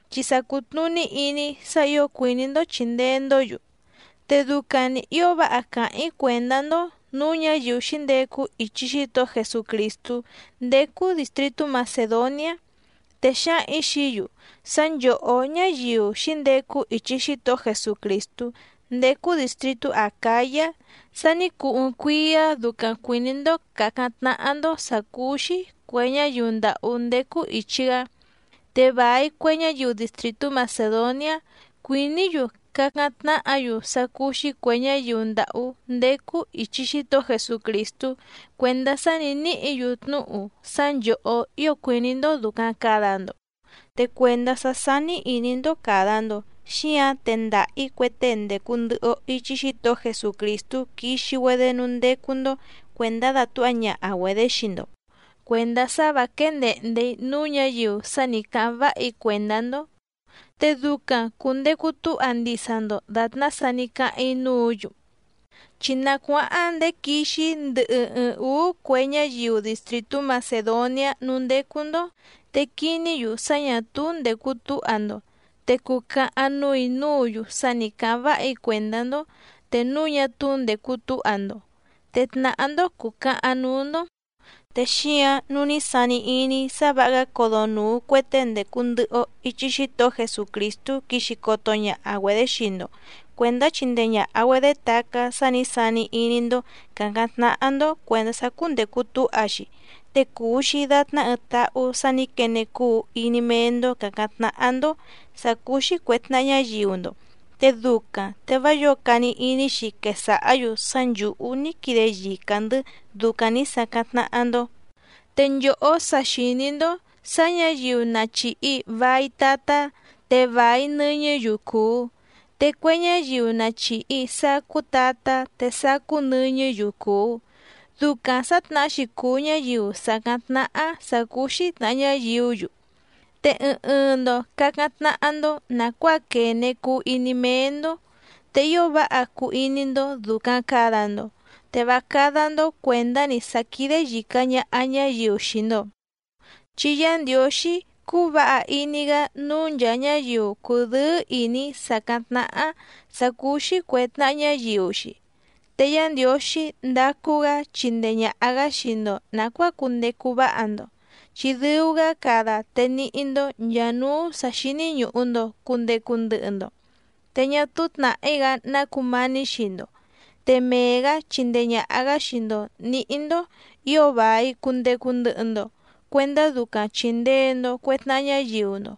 chi sa cùtnuní iní‑í sá ǐo cuìní‑ndó chìndee‑ndó‑yu. Te ducaⁿ‑ni ǐo váha càháⁿ‑í cuèndá‑ndó nǔú ñǎyiu xǐndecu ichi Xítohó Jesucrìstú ndécú dìstritú Macèdoniá, te xǎhaⁿ‑ǐ xií‑yu sá nchòhó ñáyiu xǐndecu ichi Xítohó Jesucrìstú ndécú dìstritú Acǎyá sa ní cuu ɨɨⁿ cuíá ducaⁿ cuìní‑ndó càcáⁿ tnáhá‑ndó sǎ cúú‑xí cuè ñáyiu ndàhú ndécú ìchi‑gá. Te vài cue ñáyiu distrìtú Macèdoniá cuìní‑yu cacáⁿ tnáhǎ‑yu sá cúú‑xí cuè ñáyiu ndàhú ndécú ìchi Xítohó Jesucrìstú cuèndá sá nǐ níhǐ‑yu tnúhu sá nchòhó ío cuìní‑ndó dùcaⁿ cada‑ndo. Te cuèndá sá sání ìní‑ndó càda‑ndo xíǎⁿ tendaha‑ǐ cue tée ndècu ndɨhɨ‑o ichi Xítohó Jesucrìstú quixi‑güedé núú ndécú‑ndó cuèndá dàtúha ñaha‑güedě xii‑ndo, cuèndá sá vǎ quéé ndèhnde‑í núú ñǎyiu sá nì cáháⁿ váha‑í cuèndá‑ndó, te ducaⁿ cùndecu túha ndisa‑ndo dàtná sa ní cáháⁿ‑í núǔ‑yu. Chi na cuáháⁿ ndèé quixi‑í ndɨhɨ ɨɨⁿ ǔú cue ñáyiu distrìtú Macèdoniá núú ndécú‑ndó te quiní‑yu sá ñà túú ndècu túha‑ndo, te cucahaⁿ núù‑í núǔ‑yu sá nì cáháⁿ váha‑í cuèndá‑ndó te núu ñá túú ndècu túha‑ndo, te tnàhá‑ndó cùcahaⁿ núú‑ndó. Te xíǎⁿ nǔu ní sani iní‑í sá vǎha‑gá codonùu cue tée ndècu ndɨhɨ‑o ichi Xítohó Jesucrìstú quixi coto ñaha‑güedě xii‑ndo cuèndá chindee ñàha‑güedé tacá sá nǐ sani iní‑ndó càcáⁿ tnáhá‑ndó cuèndá sá cúndècu túha‑xi, te cuu‑xi dàtná ɨɨⁿ táhú sǎ nǐ quene cuu iní méé‑ndó càcáⁿ tnáhá‑ndó sǎ cúú‑xí cuè tnaha ñáyiu‑ndo. Te ducaⁿ te vá yǒo cani iní‑xi quesàhá‑yu sá nchǔhú ní quide yica‑ndɨ̌ ducaⁿ nǐ sacáⁿ tnáhá‑ndó. Te nchòhó sa xìní‑ndó sǎ ñǎyiu na chìhi vai tatá te vài nɨñɨ́‑yu cùu, te cue ñáyiu na chìhi sacú tatá te sacú nɨñɨ́‑yu cùu. Ducaⁿ sǎtnahá‑xi cùu ñáyiu sàcáⁿ tnáhá sǎ cúú‑xí tnàha ñáyiú‑yu. Te ɨɨⁿ ɨɨⁿ‑ndo càcáⁿ tnáhá‑ndó nàcuáa quène cuu iní méé‑ndó, te ío váha cuu iní‑ndó dùcaⁿ cada‑ndo te vá cádá‑ndó cuèndá‑ni sá quídé yìca ñaha ñáyiu xii‑ndo, chi Yá Ndiǒxí cúú vǎha iní‑gá núú nchàa ñáyiu cùdɨ́ɨ́ ìní sàcáⁿ tnáhá sǎ cúú‑xí cuè tnaha ñáyiu‑xi. Te Yá Ndiǒxí ndacu‑gá chindee ñàha‑gá xii‑ndo nàcuáa cundecu váha‑ndo, chi dɨu‑gá cada te níhí‑ndó nchàa núú sǎ xíní ñùhu‑ndo cundecu ndɨhɨ‑ndo, te ñá túú tnàhí‑gá ná cumání xii‑ndo, te mee‑gǎ chindee ñàha‑gá xii‑ndo nǐhí‑ndó ǐo vài cundecu ndɨhɨ‑ndo cuendá ducaⁿ chìndee‑ndo cue tnaha ñáyiu‑ndo.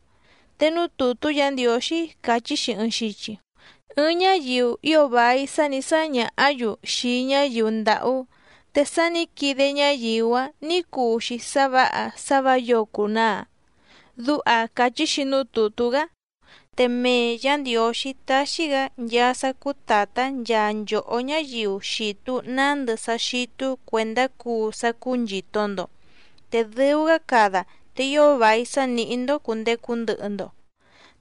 Te núú tùtú Yǎ Ndiǒxí càchí‑xi ɨɨⁿ xichi: Ɨɨⁿ ñáyiu ío vài sá nǐ sáñàhá‑yu xii ñáyiu ndàhú, te sá nǐ quide ñáyiu‑áⁿ nǐ cuu‑xi sá vǎha sá vǎ yǒo cùnaa. Duha càchí‑xi núú tùtú‑gá. Te mee Yǎ Ndiǒxí táxí‑gǎ nchaa sá cúú tàtá nchaa nchòhó ñáyiu xìtu nándɨ sá xítú cuèndá cuu sá cúú nchìto‑ndo, te dɨu‑gá cada te ío vài sá nìhí‑ndó cùndecu ndɨhɨ‑ndo,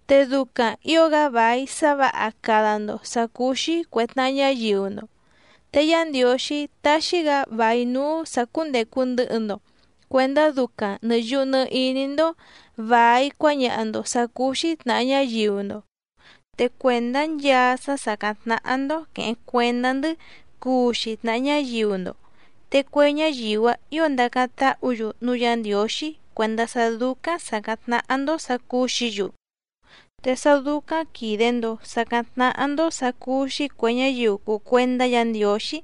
te ducaⁿ ǐo‑gá vài sá vǎha cada‑ndo sǎ cúú‑xí cuè tnaha ñáyiu‑ndo. Te Yá Ndiǒxí taxi‑gá vài núú sǎ cúndècu ndɨhɨ‑ndo cuendá ducaⁿ nɨ̀ yuhu nɨ iní‑ndó vài cuáñaha‑ndo sǎ cúú‑xí tnàha ñáyiu‑ndo. Te cuèndá nchaa sá sàcáⁿ tnáhá‑ndó quèheⁿ cuendá‑ndɨ́ cuu xii tnàha ñáyiu‑ndo, te cue ñáyiu‑áⁿ ǐo ndacáⁿ táhǔ‑yu núú Yǎ Ndiǒxí cuèndá sá dúcáⁿ sàcáⁿ tnáhá‑ndó sǎ cúú‑xǐ‑yu. Te sá dúcáⁿ quìde‑ndo sacáⁿ tnáhá‑ndó sǎ cúú‑xí cuè ñáyiu cùu cuendá Yǎ Ndiǒxí,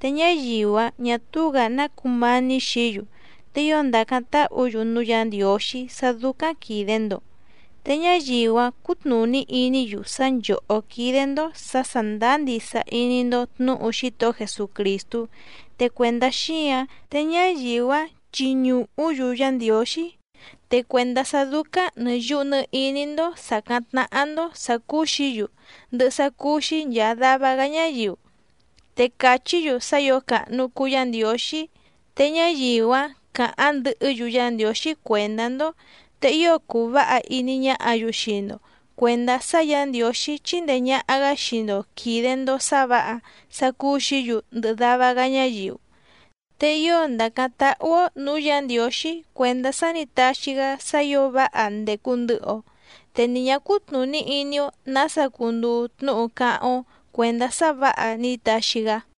te ñáyiu‑áⁿ ñà túú‑gǎ ná cumání xií‑yu, te ío ndacáⁿ táhǔ‑yu núú Yǎ Ndiǒxí sá dúcáⁿ quìde‑ndo. Te ñáyiu‑áⁿ cutnùní iní‑yu sá nchòhó quídé‑ndó sǎ sàndáá ndisa iní‑ndó tnǔhu Xítohó Jesucrìstú, te cuèndá xíǎⁿ te ñáyiu‑áⁿ chiñùhú‑yu Yá Ndiǒxí, te cuèndá sá dúcáⁿ nɨ̀ yuhu nɨ iní‑ndó sàcáⁿ tnáhá‑ndó sǎ cúú‑xǐ‑yu ndɨhɨ sá cúú‑xí nchàa dava‑gá ñáyiu, te cachí‑yu sá ǐo càhnu cuu Yá Ndiǒxí. Te ñáyiu‑áⁿ cǎháⁿ ndɨhɨ́‑yu Yá Ndiǒxí cuèndá‑ndó, te ío cuu váha iní ñáhǎ‑yu xii‑ndo cuèndá sá Yǎ Ndiǒxí chíndèe ñaha‑gá xii‑ndo quìde‑ndo sá vǎha sá cúú‑xǐ‑yu ndɨhɨ dava‑gá ñáyiu. Te ío ndàcáⁿ táhú‑ó nǔú Yǎ Ndiǒxí cuèndá sá nǐ taxi‑gá sá ǐo váha ndècu ndɨhɨ‑o, te ni ñǎ cútnùní iní‑ó nǎsa cunduu tnúhu cáháⁿ‑ó cuèndá sá vǎha ní taxi‑gá.